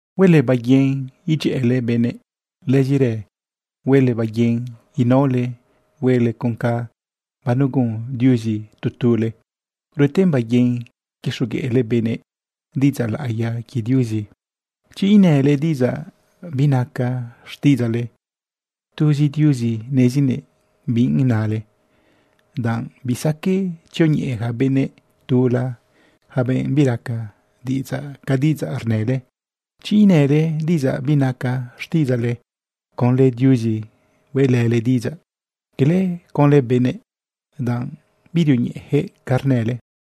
Huele baiguin idyëꞌële benëꞌ. Lëzirë huele baiguin inaole huele con ca banegun Diuzi tu tule. Rueten baiguin quixogueꞌle benëꞌ diꞌidzaꞌ laꞌiya quie Diuzi. Chi inële diꞌidzaꞌ binaca xtiꞌidzaꞌle, tuzi Diuzi nezinëꞌ bi nale, danꞌ bisaqueꞌ tzioñeꞌe yaca benëꞌ tula, yaca benꞌ biraca diꞌidzaꞌ ca diꞌidzaꞌ rnële. Chi inële diꞌidzaꞌ binaca xtiꞌidzaꞌle, conlë Diuzizi hueꞌlële diꞌidzaꞌ, cala conlë benëꞌ, danꞌ birioñeꞌeyaquëꞌ ca rnële.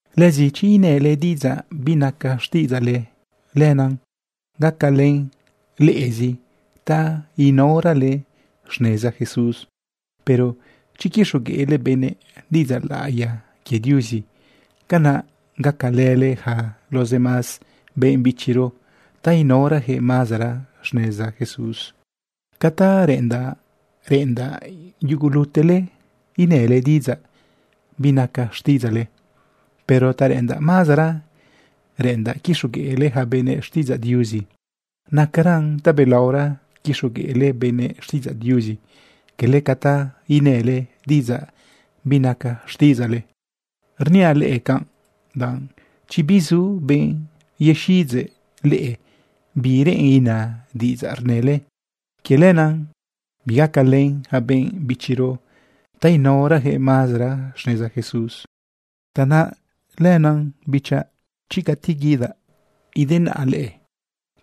Lëzi chi inële diꞌidzaꞌ binaca xtiꞌidzaꞌle, lenaꞌ gacalën leꞌezi ta inaorale xneza Jesús. Pero chi quixogueꞌle benëꞌ diꞌidzaꞌ laꞌiya quie Diuzi, canaꞌ gacalële yaca los demás benꞌ bichiro ta inaorayaquëꞌ mazara xneza Jesús. Ca ta reꞌendaꞌ, reꞌendaꞌ yugulutele inële diꞌidzaꞌ binaca xtiꞌidzaꞌle. Pero ta reꞌendaꞌ mazara, reꞌendaꞌ quixogueꞌle yaca benëꞌ xtiꞌidzaꞌ Diuzi. Nacaran tabelaora quixogueꞌle benëꞌ xtiꞌidzaꞌ Diuzi, cala ca ta inële diꞌidzaꞌ binaca xtiꞌidzaꞌle. Rniaꞌ leꞌe canꞌ danꞌ chi bizu benꞌ yexiꞌidzeꞌ leꞌe bi reꞌen ina diꞌidzaꞌ rnële, quie lenaꞌ bigacalen yaca benꞌ bichiro ta inaorayaquëꞌ mazara xneza Jesús. Tanaꞌ lenaꞌ bichaꞌ, chi cati guidaꞌ idenaꞌa leꞌe,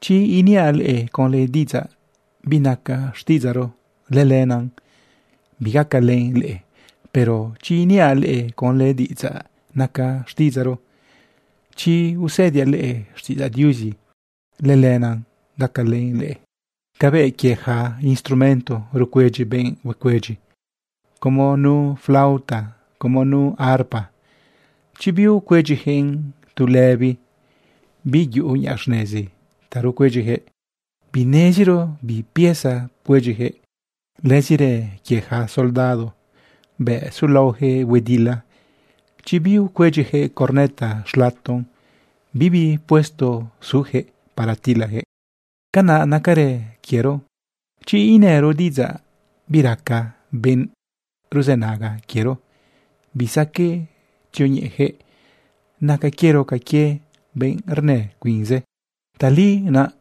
chi iniaꞌ leꞌe conlë diꞌidzaꞌ binaca xtiꞌidzaꞌro, lëlenaꞌ bigacalën leꞌe. Pero chi iniaꞌ leꞌe conlë diꞌidzaꞌ naca xtiꞌidzaꞌro, chi usëdiaꞌ leꞌe xtiꞌidzaꞌ Diuzi, lëlenaꞌ gacalën leꞌe. Cabëꞌ quie yaca instrumento rcuedyi benꞌ huecuedyi, como nu flauta, como nu harpa, chi biucuedyiyaquëꞌn tu lëbi, biyuꞌu niꞌa xnezi ta rucuedyiyaquëꞌ, bineziro bi pieza pcuedyiyaquëꞌ. Lëzirë quie yaca soldado, bëꞌ sulaoyaquëꞌ huedila, chi biucuedyiyaquëꞌ corneta xlaton, bibi puesto suyaquëꞌ para tilayaquëꞌ. Canaꞌ nacarë quiero. Chi inëro diꞌidzaꞌ biraca benꞌ ruzënaga quiero, bisaqueꞌ tzioñeꞌeyaquëꞌ. Naca quiero ca quie benꞌ rnë cuinze. Tali naꞌ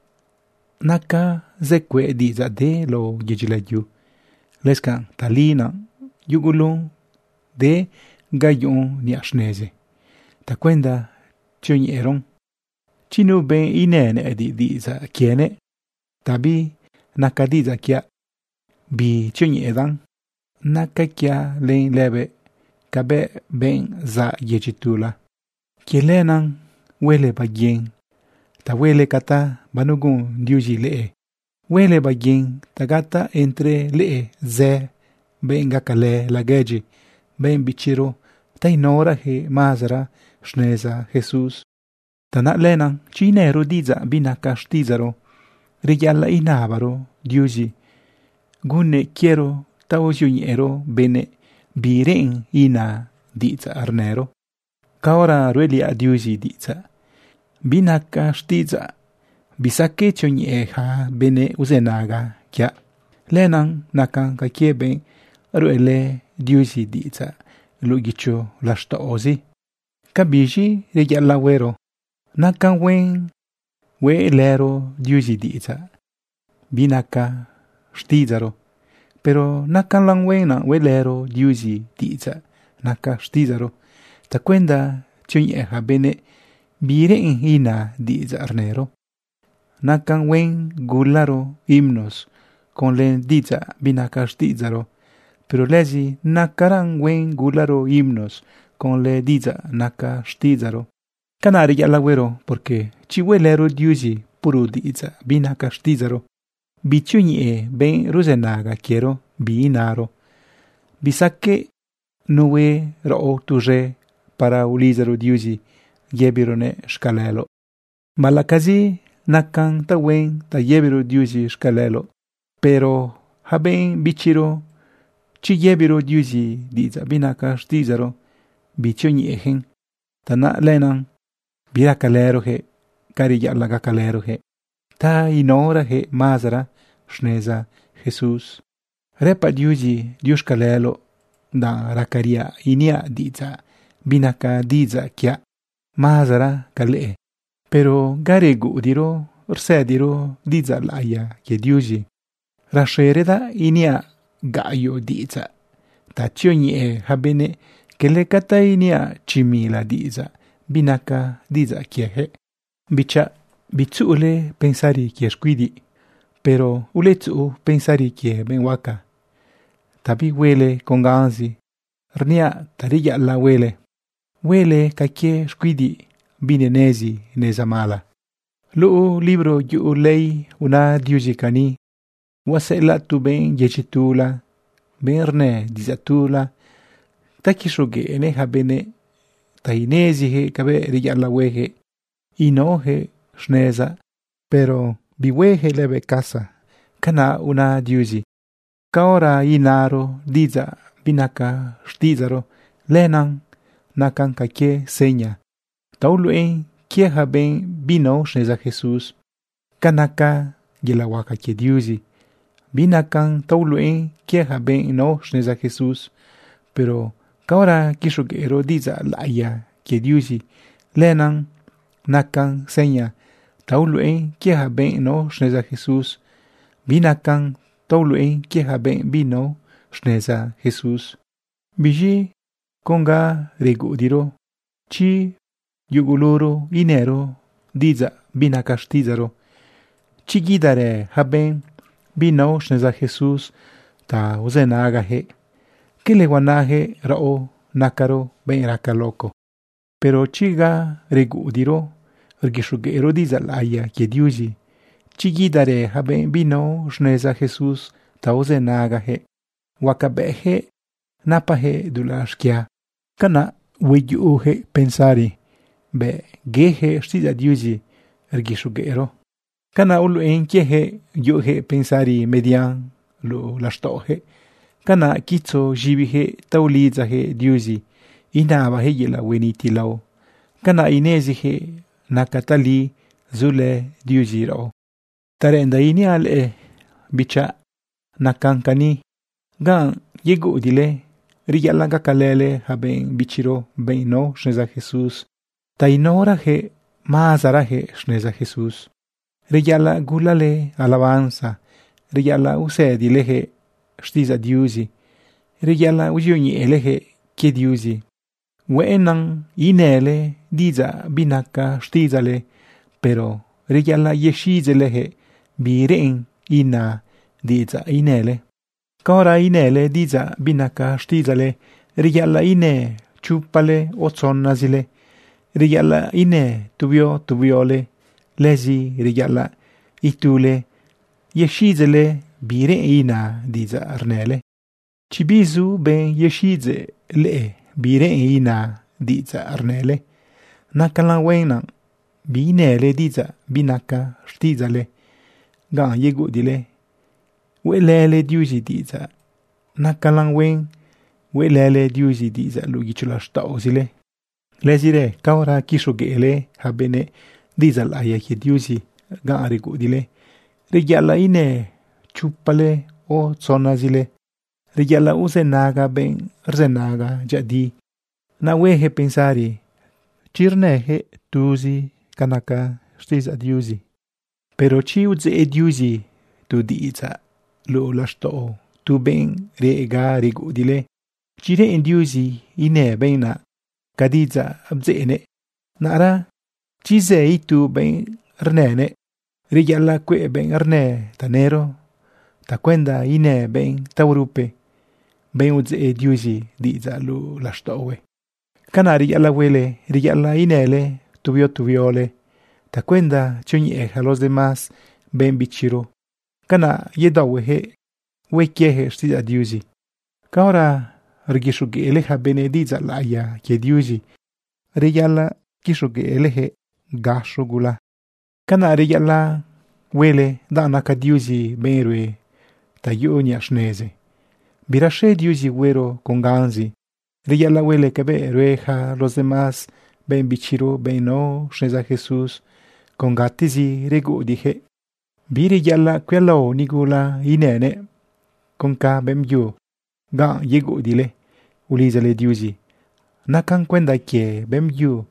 naca zë cueꞌ diꞌidzaꞌ de lao yedyi layu. Lëscanꞌ tali naꞌ yugulun de ga yuꞌun niꞌa xnezi tacuenda tzioñeꞌeron. Chi nu benꞌ inë nëꞌëdiꞌ diꞌidzaꞌ quienëꞌ ta binaca diꞌidzaꞌ quiaꞌ, bitzioñeꞌedaꞌn. Naca quiaꞌ len lëbëꞌ cabëꞌ benꞌ zaꞌ yedyi tula. Quie lenaꞌ huele baiguin ta huele ca ta banegun Diuzi leꞌe. Huele baiguin ta gataꞌ entre leꞌe zë benꞌ gacalë laguedyi benꞌ bichiro ta inaorayaquëꞌ mazara xneza Jesús. Tanaꞌ lenaꞌ chi inëro diꞌidzaꞌ binaca xtiꞌidzaꞌro, reyaꞌalaꞌ inabaro Diuzi gunnëꞌ quiero ta uzioñeꞌero benëꞌ bi reꞌen ina diꞌidzaꞌ rnëro. Caora ruꞌeliaꞌ Diuzi diꞌidzaꞌ binaca xtiꞌidzaꞌ, bisaqueꞌ tzioñeꞌe yaca benꞌ uzënaga quiaꞌ. Lenaꞌ nacan ca quie benꞌ ruꞌelë Diuzi diꞌidzaꞌ luꞌu guicho laxtaꞌozi. ¿Cabiz̃i reyaꞌalaꞌ huero? Nacan huen hueꞌlëro Diuzi diꞌidzaꞌ binaca xtiꞌidzaꞌro, pero nacalan huen hueꞌlëro Diuzi diꞌidzaꞌ naca xtiꞌidzaꞌro tacuenda tzioñeꞌe yaca benëꞌ bi reꞌen ina diꞌidzaꞌ rnëro. Nacan huen gularo himnos conlë diꞌidzaꞌ binaca xtiꞌidzaꞌro, pero lëzi nacalan huen gularo himnos conlë diꞌidzaꞌ naca xtiꞌidzaꞌro. Canaꞌ reyaꞌalaꞌ huero, porque chi hueꞌlëro Diuzi puro diꞌidzaꞌ binaca xtiꞌidzaꞌro, bitzioñeꞌe benꞌ ruzënaga quiero bi naro. Bisaqueꞌ nu hue raꞌo tuz̃e para ulidzaro Diuzi yëbiroguëꞌ xcaleloꞌ. Baꞌalaꞌcazi nacan tahuen ta yëbiro Diuzi xcaleloꞌ, pero para yaca benꞌ bichiro, chi yëbiro Diuzi diꞌidzaꞌ binaca xtiꞌidzaꞌro, bitzioñeꞌeyaquëꞌ. Tanaꞌ lenaꞌ biracalëroyaquëꞌ ca reyaꞌalaꞌ gacalëroyaquëꞌ ta inaorayaquëꞌ mazara xneza Jesús. Rëpaꞌ Diuzi diuxcaleloꞌ danꞌ racariaꞌ iniaꞌ diꞌidzaꞌ binaca diꞌidzaꞌ quiaꞌ mazara ca leꞌe. Pero ga reguꞌudiꞌro rsëdiro diꞌidzaꞌ laꞌiya quie Diuzi, rexeradaꞌ iniaꞌ gaꞌyoꞌ diꞌidzaꞌ ta tzioñeꞌe yaca benëꞌ, cala ca ta iniaꞌ chi mila diꞌidzaꞌ binaca diꞌidzaꞌ quieyaquëꞌ. Bichaꞌ, bitzuꞌule pensari quie xcuidiꞌ. Pero uletzuꞌu pensari quie benꞌ huaca ta bihuele con ganzi. Rniaꞌ ta reyaꞌalaꞌ huele, huele ca quie xcuidiꞌ binenezi neza mala. Luꞌu libro yuꞌu ley una Diuzi cani: “Huaseꞌelaꞌ tu benꞌ yedyi tula, benꞌ rnë diꞌidzaꞌ tula, ta quixogueꞌnëꞌ yaca benëꞌ ta ineziyaquëꞌ cabëꞌ reyaꞌalaꞌ huejëꞌ inaojëꞌ xnezaꞌ, pero bihueyaquëꞌ lëbëꞌ casa.” Canaꞌ una Diuzi. Caora inaro diꞌidzaꞌ binaca xtiꞌidzaꞌro, lenaꞌ nacan ca quie seña ta uluꞌen quie yaca benꞌ binao xneza Jesús ca naca yelaꞌ huaca quie Diuzi. Binacan ta uluꞌen quie yaca benꞌ nao xneza Jesús. Pero caora quixogueꞌro diꞌidzaꞌ laꞌiya quie Diuzi, lenaꞌ nacan seña ta uluꞌen quie yaca benꞌ nao xneza Jesús, binacan ta uluꞌen quie yaca benꞌ binao xneza Jesús. Biz̃i con ga reguꞌudiꞌro, chi yuguluro inëro diꞌidzaꞌ binaca xtiꞌidzaꞌro, chi guidarë yaca benꞌ binao xneza Jesús ta uzënagayaquëꞌ, ¿cala huanayaquëꞌ raꞌo nacaro benꞌ raca loco? Pero chi ga reguꞌudiꞌro rguixogueꞌro diꞌidzaꞌ laꞌiya quie Diuzi, chi guidarë yaca benꞌ binao xneza Jesús ta uzënagayaquëꞌ, huacabëꞌyaquëꞌ napajëꞌ dulaꞌ xquia. Canaꞌ hueyuꞌuyaquëꞌ pensari bëꞌ yeyaquëꞌ xtiꞌidzaꞌ Diuzi rguixogueꞌro. Canaꞌ uluꞌen quieyaquëꞌ yuꞌuyaquëꞌ pensari median luꞌu laxtaꞌoyaquëꞌ. Canaꞌ quitzo z̃ibiyaquëꞌ ta ulidzayaquëꞌ Diuzi inabayaquëꞌ yelaꞌ huenitilao. Canaꞌ ineziyaquëꞌ nacan tali zulë Diuzi raꞌo. Ta reꞌendaꞌ iniaꞌ leꞌe, bichaꞌ, nacan cani: Ganꞌ yeguꞌudiꞌle, reyaꞌalaꞌ gacalële yaca benꞌ bichiro, benꞌ nao xneza Jesús ta inaorayaquëꞌ mazarayaquëꞌ xneza Jesús. Reyaꞌalaꞌ gulale alabanza. Reyaꞌalaꞌ usëdileyaquëꞌ xtiꞌidzaꞌ Diuzi. Reyaꞌalaꞌ uzioñeꞌeleyaquëꞌ quie Diuzi. Hueꞌennan inële diꞌidzaꞌ binaca xtiꞌidzaꞌle, pero reyaꞌalaꞌ yexiꞌidzeꞌleyaquëꞌ bi reꞌen ina diꞌidzaꞌ inële. Caora inële diꞌidzaꞌ binaca xtiꞌidzaꞌle, reyaꞌalaꞌ inë chopale o tzonazile. Reyaꞌalaꞌ inë tu huio tu huiole. Lëzi reyaꞌalaꞌ itule yexiꞌidzeꞌle bi reꞌen ina diꞌidzaꞌ rnële. Chi bizu benꞌ yexiꞌidzeꞌ leꞌe bi reꞌen ina diꞌidzaꞌ rnële, nacalan huen biinële diꞌidzaꞌ binaca xtiꞌidzaꞌle ganꞌ yeguꞌudiꞌle hueꞌlële Diuzi diꞌidzaꞌ. Nacalan huen hueꞌlële Diuzi diꞌidzaꞌ luꞌu guicho laxtaꞌozile. Lëzirë caora quixogueꞌle yaca benëꞌ diꞌidzaꞌ laꞌiya quie Diuzi ganꞌ reguꞌudiꞌle, reyaꞌalaꞌ inë chopale o tzonazile. Reyaꞌalaꞌ uzënaga benꞌ rzënaga dyëꞌëdi, naꞌ hueyaquëꞌ pensari chi rnëyaquëꞌ tuzi ca naca xtiꞌidzaꞌ Diuzi. Pero chi udzeꞌ Diuzi tu diꞌidzaꞌ luꞌu laxtaꞌo tu benꞌ reꞌ ga reguꞌudiꞌle, chi reꞌen Diuzi inë benꞌ naꞌ ca diꞌidzaꞌ bdzeꞌnëꞌ, naꞌra chi zë itu benꞌ rnënëꞌ, reyaꞌalaꞌ cueꞌ benꞌ rnë tanëro tacuenda inë benꞌ taorupe, benꞌ udzeꞌ Diuzi diꞌidzaꞌ luꞌu laxtaꞌohue. Canaꞌ reyaꞌalaꞌ huele, reyaꞌalaꞌ inële tu huio tu huiole tacuenda tzioñeꞌe yaca los demás benꞌ bichiro. Canaꞌ yedaohueyaquëꞌ hue quieyaquëꞌ xtiꞌidzaꞌ Diuzi. Caora rguixogueꞌle yaca benëꞌ diꞌidzaꞌ laꞌiya quie Diuzi, reyaꞌalaꞌ quixogueꞌleyaquëꞌ de gaxo gula. Canaꞌ reyaꞌalaꞌ huele danꞌ naca Diuzi benꞌ rue ta yuꞌu niꞌa xnezi. Biraxe Diuzi huero con ganzi. Reyaꞌalaꞌ huele cabëꞌ rue yaca los demás benꞌ bichiro, benꞌ nao xneza Jesús con gatezi reguꞌudiꞌyaquëꞌ. Bireyaꞌalaꞌ cuialao nigula inënëꞌ con ca beꞌmbyu ganꞌ yeguꞌudiꞌle ulidzale Diuzi. Nacan cuenda quie beꞌmbyu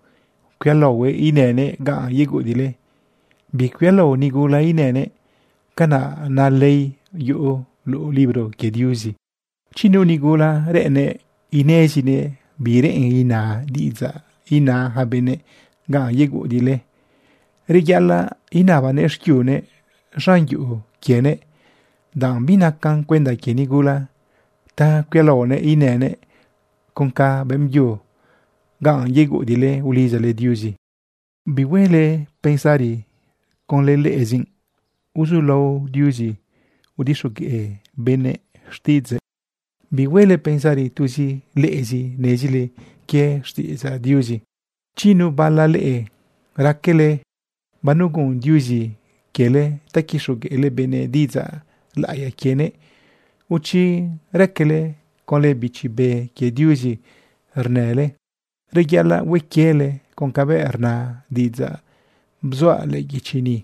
cuialaohuëꞌ inënëꞌ ganꞌ yeguꞌudiꞌle, bicuialao nigula inënëꞌ. Canaꞌ na ley yuꞌu luꞌu libro quie Diuzi. Chi nu nigula reꞌennëꞌ inezinëꞌ bi reꞌen ina diꞌidzaꞌ ina ja benëꞌ ganꞌ yeguꞌudiꞌle, reyaꞌalaꞌ inabanëꞌ xquiunëꞌ z̃an yuꞌu quienëꞌ, danꞌ binacan cuenda quie nigula ta cuialaonëꞌ inënëꞌ con ca beꞌmbyu ganꞌ yeguꞌudiꞌle ulidzale Diuzi. Bihuele pensari conlë leꞌezi uzulao Diuzi udixogueꞌ benëꞌ xtiꞌidzëꞌ. Bihuele pensari tuzi leꞌezi nezile quie xtiꞌidzaꞌ Diuzi. Chi nu bala leꞌe raquele banegun Diuzi quiele ta quixogueꞌle benëꞌ diꞌidzaꞌ laꞌiya quienëꞌ, o chi raquele conlë Bichi Be quie Diuzi rnële, reyaꞌalaꞌ hue quiele con cabëꞌ rna diꞌidzaꞌ bzuaꞌ lëꞌë guichi ni,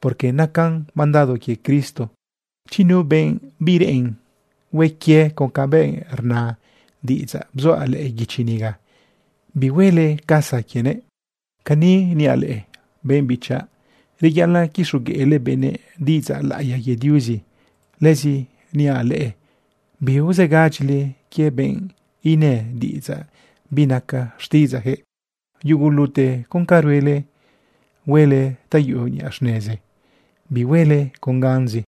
porque nacan mandado quie Cristo. Chi nu benꞌ bireꞌen hue quie con cabëꞌ rna diꞌidzaꞌ bzuaꞌ lëꞌë guichi niga, bihuele casa quienëꞌ. Cani niaꞌ leꞌe benꞌ bichaꞌ: Reyaꞌalaꞌ quixogueꞌle benëꞌ diꞌidzaꞌ laꞌiya quie Diuzi. Lëzi niaꞌ leꞌe biuzegadyile quie benꞌ inë diꞌidzaꞌ binaca xtiꞌidzaꞌyaquëꞌ. Yugulute con ca ruele, huele ta yuꞌu niꞌa xnezi, bihuele con ganzi.